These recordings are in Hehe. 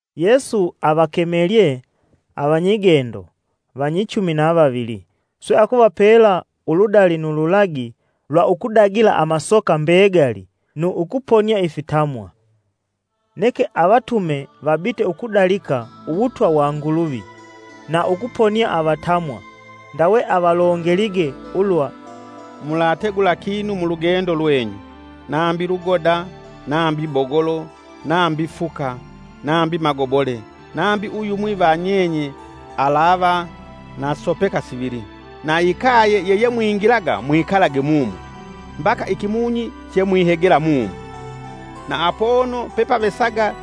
Yesu avakemelye avanyigendo vanyichumi na vavili swe akuvapela uludali nu lulagi lwa ukudagila amasoka mbegali nu ukuponia ifitamwa. Neke avatume vabite ukudalika uwutwa wa Nguluvi na ukuponia avatamwa. Ndawe avalongelige ulwa, “Mulategula kinu mulugendo lwenyu, nambi lugoda, nambi bogolo, nambi fuka, nambi magobole nambi uyumwi va nyenye aalava na sopeka sivili. Na ikaye yeyemwingilaga, mwikalage mumo, mbaka ikimunyi chemwihegela mumo. Na apono pepavesaga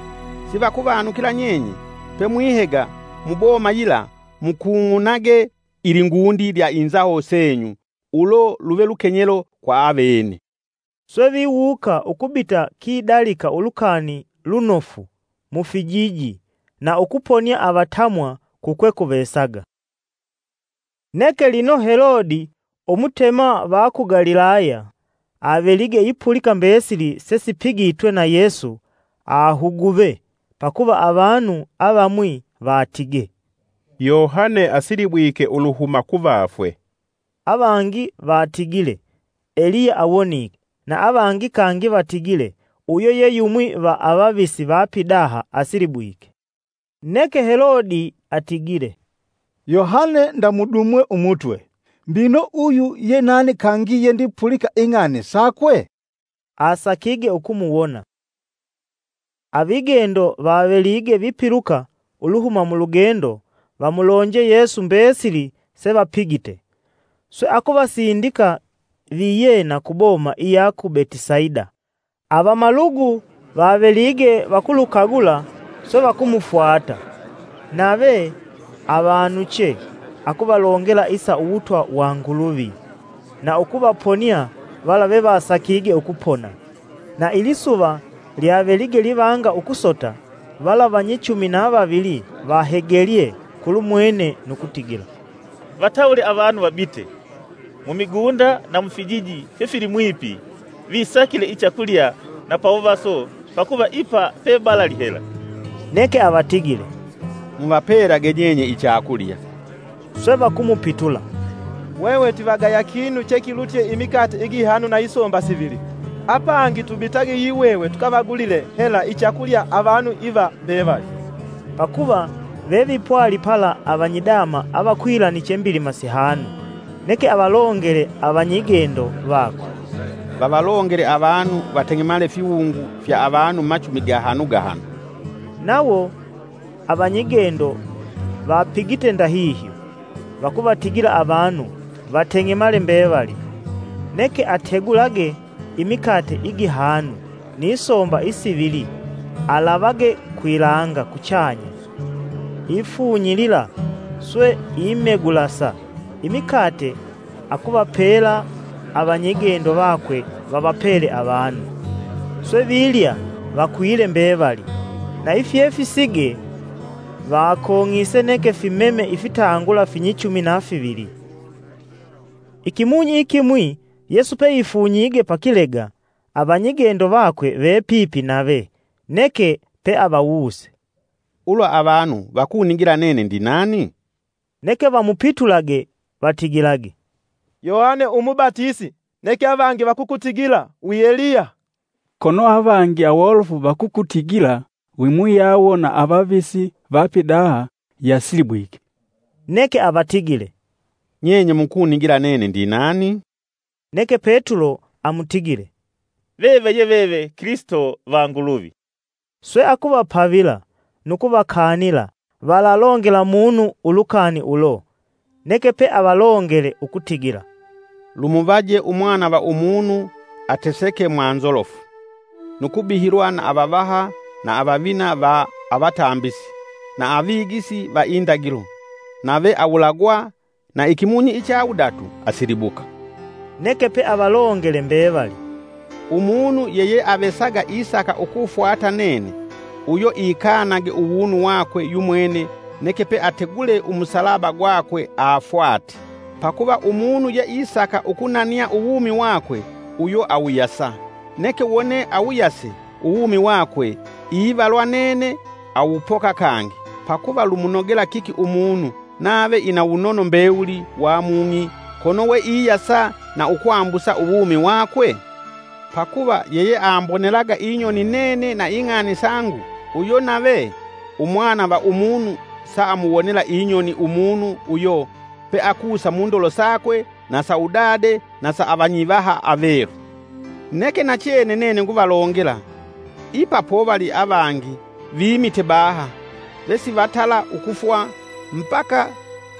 sivakuvanukila nyenye pemwihega mu boma yila mukung'unage ilingundi lya inzaho senyu ulo luve lukenyelo kwa avene.” Swe viwuuka ukubita kidalika Ulukani Lunofu mu fijiji na ukuponia avatamwa kukwekuvesaga. Neke lino Helode umutema va ku Galilaya avelige ipulika mbesili sesipigitwe na Yesu, ahuguve pakuva avanu avamwi vatige, “Yohane asilibwike uluhuma kuvafwe!” Avangi vatigile Eliya awonike, na avangi kangi vatigile uyo ye yumwi va avavisi va pidaha asilibwike. Neke Helode atigile, “Yohane ndamudumwe umutwe; mbino uyu yenani kangi yendipulika ing'ani sakwe?” Asakige ukumuwona. Avigendo vavelige vipiluka uluhuma mulugendo vamulonje Yesu mbesili sevapigite. Swe akuvasindika viyena ku boma iya ku Betisaida. Avamalugu vavelige vakulukagula swe vakumufwata, nave avanuche akuvalongela isa uwutwa wa Nguluvi, na ukuvaponia vala vevasakige ukupona. Na ilisuva lyavelige livanga ukusota, vala vanyichumi na vavili vahegelye kulumwene nu kutigila, “Vatawule avanu vabite, mumigunda na mufijiji fyefilimwipi visakile ichakulya na pawuvaso pakuva ipa pebalali hela.” Neke avatigile, “Muvapelage nyenye ichakulya.” Swe vakumupitula, “Hwehwe twivagaya kinu chekilutye imikate igihanu na isomba sivili. Apangi tubitage yihwehwe tukavagulile hela ichakulya avanu iva mbevali!” (Pakuva vevipwali pala avanyidama avakwilaniche mbilima sihanu.) Neke avalongele avanyigendo vakwe, “Vavalongele avanu vateng'emale fiwungu fya avanu machumi gahanu gahanu.” Nawo avanyigendo vapigite ndahihyo, vakuvatigila avanu vateng'emale mbevali. Neke ategulage imikate igihanu ni somba isivili alavage kwilanga kuchanya, ifunyilila swe imegulasa imikate akuvapela avanyigendo vakwe vavapele avanu. Swe vilya vakwile mbevali na ifyefisige vakong'ise neke fimeme ifitangula finyichumi na fivili. Ikimunyi ikimwi, Yesu peifunyige pakilega, avanyigendo vakwe vepipi nave. Neke peavawuse, “Ulwa avanu vakunigila nene ndinani?” Neke vamupitulage vatigilage, “Yohane umubatisi, neke avangi vakukutigila wi Eliya, kono avangi awolofu vakukutigila wimuyawo va avavisi vapidaha yasilibwike.” Neke avatigile, “Nyenye mukunigila nene ndinani?” Neke Petulo amutigile, “Veve ye veve Kilisito va Nguluvi.” Swe akuvapavila nu kuvakanila valalongela munu ulukani ulo. Neke pe avalongele ukutigila, “Lumuvaje Umwana va Umunu ateseke mwa nzolofu, nu kubihilwa na avavaha, na avavina va avatambisi na avigisi va indagilo nave awulagwa na ikimunyi icha wudatu asilibuka.” Neke peavalongele mbevali, “Umunu yeyeavesaga isaka ukufwata nene, uyo ikanage uwunu wakwe yumwene, neke peategule umusalaba gwakwe afwate. Pakuva umunu yeisaka ukunania uwumi wakwe uyo awuyasa, neke wone awuyase uwumi wakwe ivalwa nene awupoka kangi. Pakuva lumunogela kiki umunu nave ina wunono mbewuli wa Mung'i kono we iyasa na ukwambusa uwumi wakwe? Pakuva yeyeambonelaga inyoni nene na ing'ani sangu, uyo navee Umwana va Umunu saamuwonela inyoni umunu uyo peakusa mundolo sakwe na sa udade na sa avanyivaha avelu. Neke nachene nene nguvalongela, ipa povali avangi vimite baha vesivatala ukufwa mbaka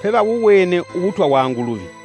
pevawuwene uwutwa wa Nguluvi.”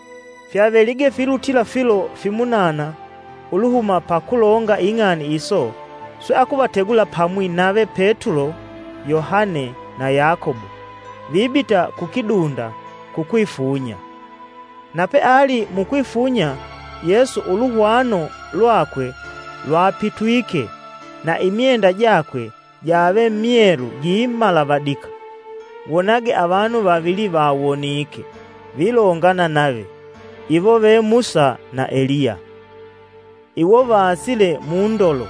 Fyavelige filutila filo fimunana uluhuma pa kulonga ing'ani iso swe akuvategula pamwi nave Petulo, Yohane na Yakobo, vibita ku kidunda kukwifunya. Na peali mukwifunya Yesu uluhwano lwakwe lwapitwike, na imyenda jakwe jave myelu gimalavadika. Wonage avanu vavili vawonike vilongana nave, iwo ve Musa na Eliya. Iwo vaasile mundolo,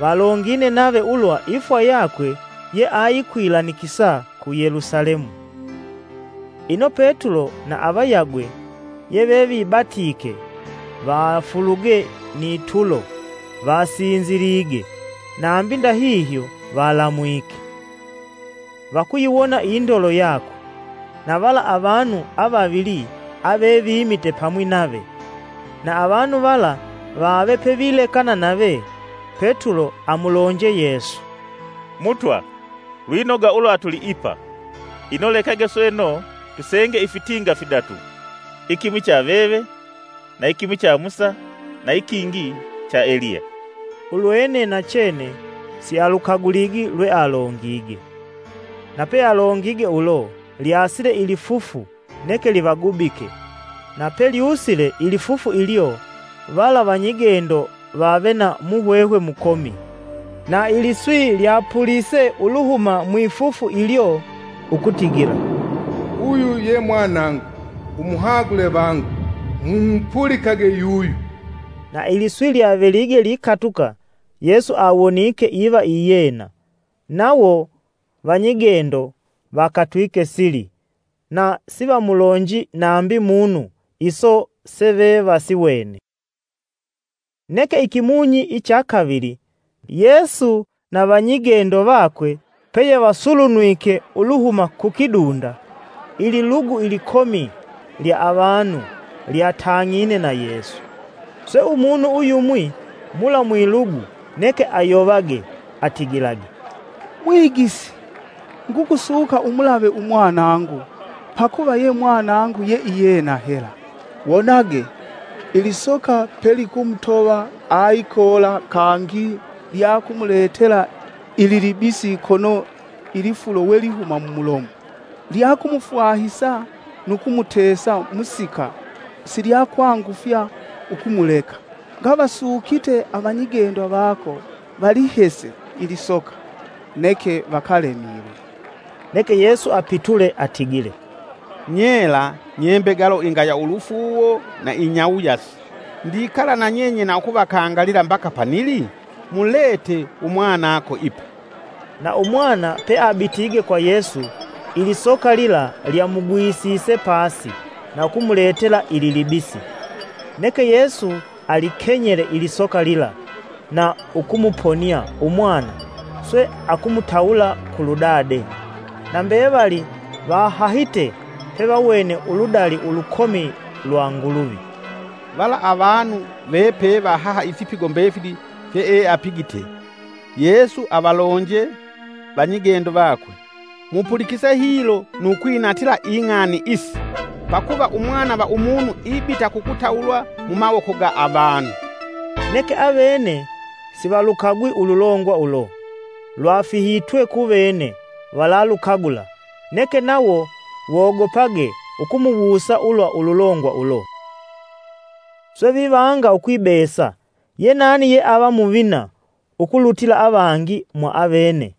valongine nave ulwa ifwa yakwe ye ayikwilanikisa ku Yelusalemu. Ino Petulo na avayagwe yevevibatike vafuluge ni tulo vasinzilige, nambi ndahihyo valamwike, vakuyiwona indolo yakwe, na vala avanu avavili avevimite pamwi nave. Na avanu vala vave pevilekana nave, Petulo amulonje Yesu, “Mutwa, lwinoga ulwa tuliipa ino lekage sweno tusenge ifitinga fidatu, ikimwi cha veve na ikimwi cha Musa na ikingi cha Eliya.” Ulwene nachene sialukaguligi lwealongige. Na pealongige ulo, lyasile ilifufu neke livagubike, na pelyusile ilifufu ilyo, vala vanyigendo vave na muhwehwe mukomi. Na iliswi lyapulise uluhuma mwifufu ilyo ukutigila, “Uyu ye Mwanangu, umuhagule vangu mumupulikage yuyu!” Na iliswi lyavelige likatuka, Yesu awonike iva iyena. Nawo vanyigendo vakatwike sili na sivamulonji nambi munu iso sevevasiwene. Neke ikimunyi icha kavili, Yesu na vanyigendo vakwe peyevasulunwike uluhuma ku kidunda, ililugu ilikomi lya avanu lyatang'ine na Yesu. Swe umunu uyumwi, mula mwilugu neke ayovage atigilage, “Mwigisi! Ngukusuka umulave umwanangu, pakuva ye mwanangu yeiyena hela! Wonage, ilisoka pe likumutova aikoola kangi lyakumuletela ililibisi kono ilifulo we lihuma mumulomo. Lyakumufwahisa nu kumutesa musika silyakwangufya ukumuleka. Ngavasukite avanyigendo vako, valihese ilisoka, neke vakalemilwe.” Neke Yesu apitule atigile, “Nyela nye mbegalo ingaya ulufuuwo na inyawuyasi! Ndikala na nyenye na ukuvakangalila mbaka panili?” “Mulete umwanako ipa.” Na umwana peabitige kwa Yesu ilisoka lila lyamugwisise pasi na ukumuletela ililibisi. Neke Yesu alikenyele ilisoka lila, na ukumuponia umwana swe akumutawula kulu dade. Na mbevali vahahite pevawene uludali ulukomi lwa Nguluvi. Vala avanu vepevahaha ifipigo mbefili fyeeapigite, Yesu avalonje vanyigendo vakwe, “Mupulikise hilo nu kwinatila ing'ani isi pakuva Umwana va Umunu ibita kukutawulwa mumawoko ga avanu.” Neke avene sivalukagwi ululongwa ulo, lwafihitwe kuvene valalukagula, neke nawo wogopage ukumuwusa ulwa ululongwa ulo. Yenani Umuvina yealutye? Swe vivanga ukwibesa yenani yeava muvina ukulutila avangi mwaavene.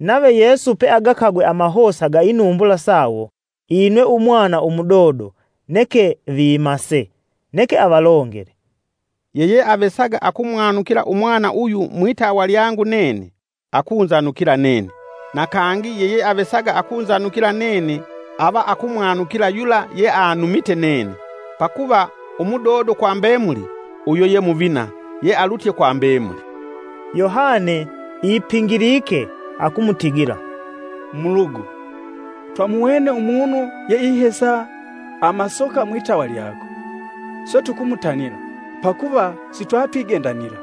Nave Yesu peagakagwe amahosa ga inumbula sawo inwe umwana umudodo neke vimase, neke avalongele, “Yeyeavesaga akumwanukila umwana uyu mwitawa lyangu nene, akunzanukila nene: na kangi yeyeavesaga akunzanukila nene ava akumwanukila yula yeanumite nene. Pakuva umudodo kwa mbemuli uyo ye muvina yealutye kwa mbemuli.” Yohane ipingilike akumutigila, “Mulugu, twamuwene umunu yeihesa amasoka mwitawa lyako, swe tukumutanila, pakuva sitwatwigendanila.”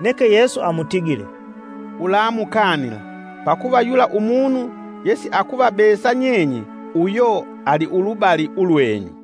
Neke Yesu amutigile, “Ulamukanila, pakuva yula umunu yesiakuvabesa nyenye uyo aliulubali ulwenyu.”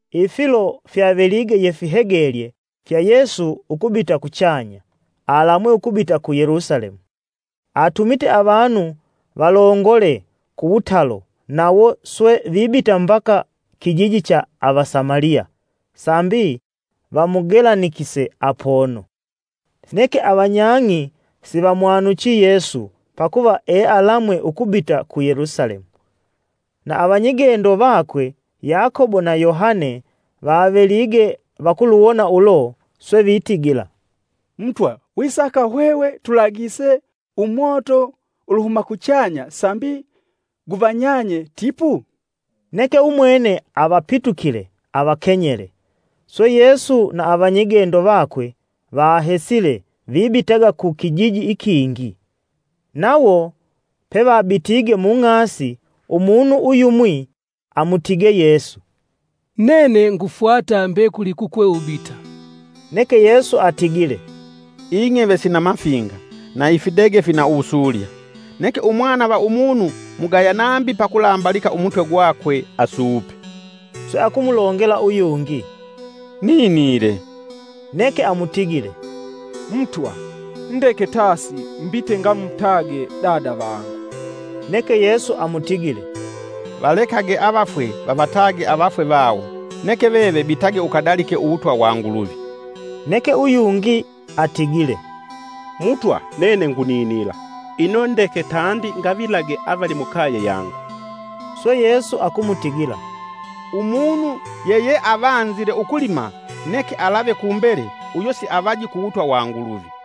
Ifilo fyavelige yefihegelye fya Yesu ukubita kuchanya, alamwe ukubita ku Yelusalemu. Atumite avanu valongole kuwutalo, nawo swe vibita mbaka kijiji icha Avasamaliya, sambi vamugelanikise apono. Neke avanyang'i sivamwanuchi Yesu, pakuva ealamwe ukubita ku Yelusalemu. Na avanyigendo vakwe Yakobo na Yohane vavelige vakuluwona ulo, swe vitigila, “Mutwa wisaka hwehwe tulagise umoto uluhuma kuchanya sambi guvanyanye tipu?” Neke umwene avapitukile avakenyele. Swe Yesu na avanyigendo vakwe vahesile, vibitaga ku kijiji ikingi. Nawo pevabitige mung'asi, umunu uyumwi amutige Yesu, “Nene ngufwata mbekuli kukwe ubita.” Neke Yesu atigile, “Ing'eve sina mafinga, na ifidege fina uwusulya, neke Umwana va Umunu mugaya nambi pakulambalika umutwe gwakwe asuupe.” Swe akumulongela uyungi, “Ninile.” Neke amutigile, “Mutwa, ndeke tasi mbite ngamutage dada vangu.” Neke Yesu amutigile, “Valekage avafwe vavatage avafwe vawo, neke veve bitage ukadalike uwutwa wa Nguluvi.” Neke uyungi atigile, “Mutwa nene nguninila; ino ndeke tandi ngavilage avali mukaye yangu.” Swe Yesu akumutigila, “Umunu yeyeavanzile ukulima neke alave kumbele uyo siavaji kuwutwa wa Nguluvi.”